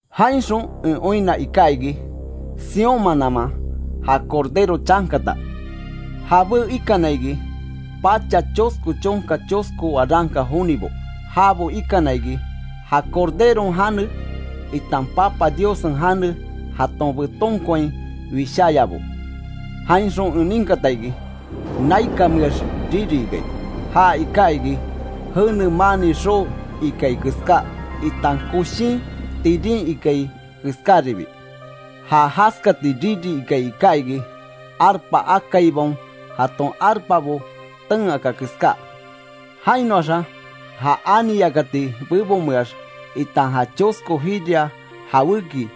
Jainxon en oinna iká iki, Sión mananman ja Cordero chankata. Jabé ikana iki pacha chosko chonka chosko waranka jonibo, jabo ikana iki ja Corderon jane, itan Papa Diossen jane jaton betonkoain wisháyabo. Jainxon en ninkata iki naikanmeax riri ikai, ja iká iki jene maani xoo ikai keská itan koshin tirin ikai keskáribi. Ja jaskati riri ikai iká iki, arpa akaibaon jaton arpabo ten aka keská. Jainoaxa ja ani yakati bebonmeax itan ja chosko jiria jawéki,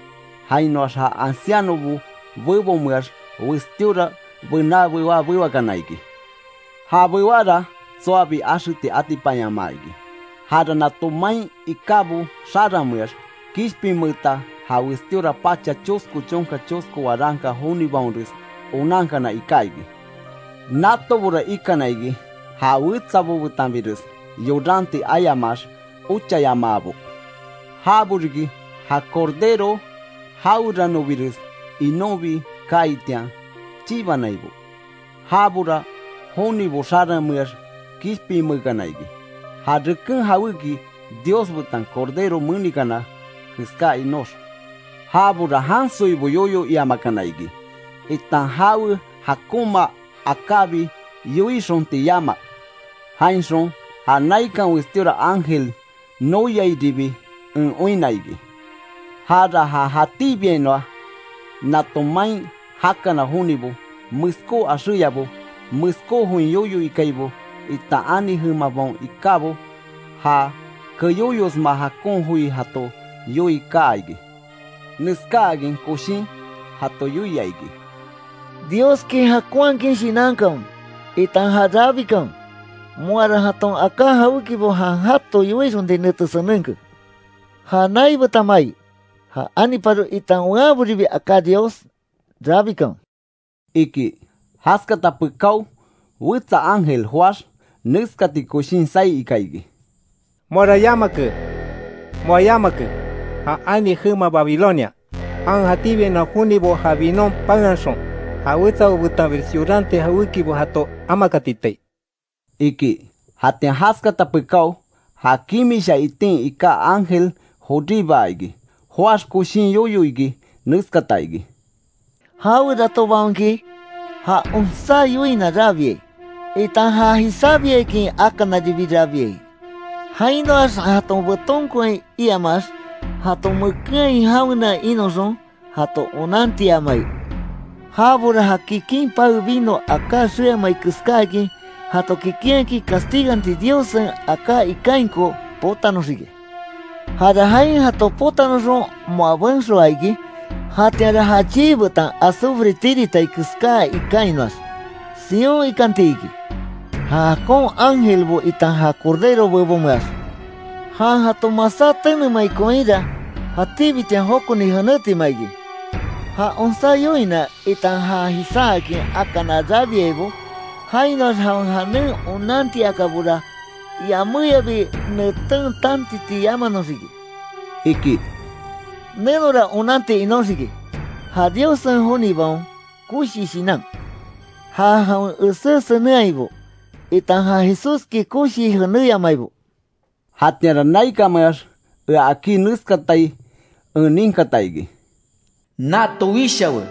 jainoax ja ancianobo bebonmeax westíora bená bewá bewakana iki. Ja bewára tsoabi axeti atipanyamaa iki. Jara nato main ikábo xaranmeax kishpinmeeta ja westíora pacha chosko chonka chosko waranka jonibaonres onankana iká iki. Natobora ikana iki ja wetsabo betanbires yoranti ayamaax, ochayamaabo. Jabo riki ja Cordero jaweranobires inonbi kaaitian, chibanaibo. Jabora jonibo xaranmeax kishpinmeekana iki, ja reken jawéki Dios betan Cordero menikana keská inox. Jabora jansoibo yoyo iamakana iki, itan jawe jakonma akábi yoixonti yama. Jainxon ja naikan westíora ángel noyairibi en oinna iki. Jara ja jatíbiainoa nato main jakana jonibo, meskó axéyabo, meskó join yoyo ikaibo, itan ani jemabaon ikábo, ja keyóyosma jakon joi jato yoii kaa iki. Neskáakin koshin jato yoia iki: “Dioski jakonhakin shinankanwe, itan já rabikanwe. Moara jaton aká jawékibo jan jato yoixonti nete senenke. Ja nai betan mai, ja aniparo itan weanboribi aká Dios rabikanwe”, iki. Jaskata pekáo wetsa ángel joáx neskati koshin saí ika iki: “¡Moara yamake, moa yamake, ja ani jema Babilonia. Jan jatíbiainoa jonibo ja vinon paenhaxon, ja wetsabo betanbires yoranti jawékibo jato amakatitai!” iki. Jatian jaskata pekáo ja kimisha itin iká ángel joríbaa iki. Joáx koshin yoyo iki neskata iki: “Jaweratobaonki ja onsá yoina rabiai, itan já jisábiakin akanaribi rabiai, jainoax jaton betonkoain iamaax jaton mekenhain jawena inoxon jato onantiamai, jabora ja kikin pae vino aká xeamai keskáakin jato kikinhakin castiganti Diossen aká ikainko, potanoxiki. Jara jain jato potanoxon moa benxoa iki. Jatianra ja chii betan azufre tiritai keská ikainoax sion ikanti iki; ja jakon ángelbo itan ja Cordero bebonmeax. Jan jato masá tenemai koinra, jatíbitian jokoni jenétima iki. Ja onsá yoina itan já jisáakin akana rabiaibo, jainoax jawen janen onantiakabora, yaméyabi neten tantiti yamanoxiki”, iki. ¡Nenora onanti inóxiki, ja Diossen jonibaon koshi shinan, ja jawen esé senenhaibo, itan ja Jesúski koshii jenéyamaibo! Jatianra naikanmeax ea akí neskatai en ninkata iki: “Nato wishawe: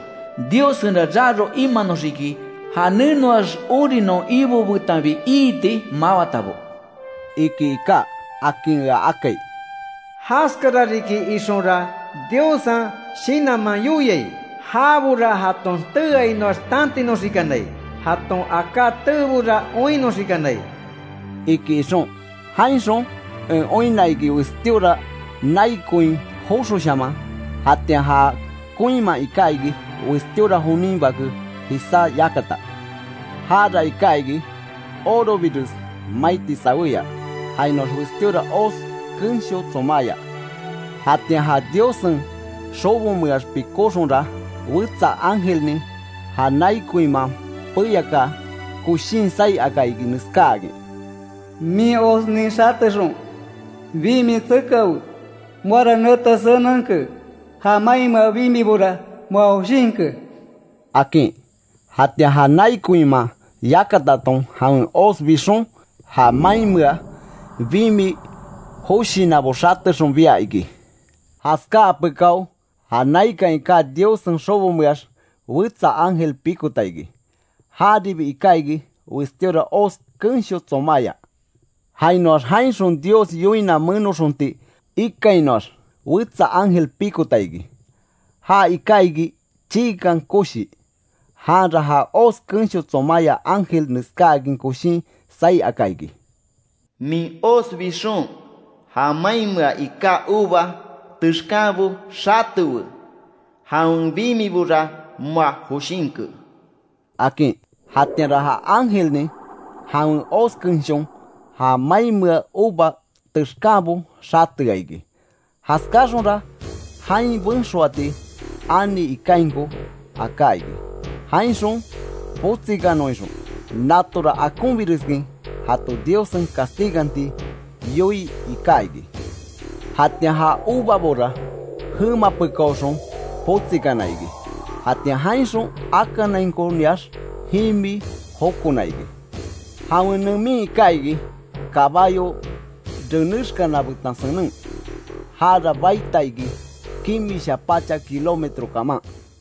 ‘Diossenra raro imanoxiki, ja nenoax ori non Ibo betanbi iiti mawatabo’”, iki iká. Akin ea akai. “Jaskara riki ixonra Diossen Shinanman yoiai. Jabora jaton teeainoax tantinoxikanai, jaton aká teebora oinnoxikanai”, iki ixon. Jainxon en oinna iki westíora nai koin joxoshaman, jatian ja koinman iká iki, westíora jonin bake jisá yakata. Jara iká iki, orobires maiti sawéya, jainoax westíora hoz kensho tsomáya. Jatian ja Diossen xobomeax pikóxonra, wetsa ángelnin ja nai koinman peyakaa koshin saí aka iki, neskáakin: “¡Min hoznin xatexon bimi tsekawe, moara nete senenke, ja mainmea bimibora moa joshinke!” akin. Jatian ja nai koinman yakataton jawen hoz bixon, ja mainmea bimi joshinabo xatexon bia iki. Jaskáa pekáo, ja naikan iká Diossen xobomeax wetsa ángel pikota iki. Jaribi iká iki, westíora hoz kensho tsomáya. Jainoax jainxon Dios yoina menoxonti ikainoax wetsa ángel pikota iki, ja iká iki chiikan koshi. Janra ja hoz kensho tsomáya ángel neskáakin koshin saí aka iki: “¡Min hoz bixon, ja mainmea iká uva texkanbo xatewe. Jawen bimibora moa joshinke!” akin. Jatianra ja ángelnin jawen hoz kenshon ja mainmea uva texkanbo xatea iki. Jaskáaxonra jain benxoati ani ikainko aká iki, jainxon potsikanon ixon. Natora akonbireskin jato Diossen castiganti yoii iká iki. Jatian ja uvabora jema pekaoxon potsikana iki. Jatian jainxon akanainkoniax, jimi jokona iki. Jawen nemin iká iki, kabayo renexkana betan senen; jara baita iki kimisha pacha kilómetro kaman.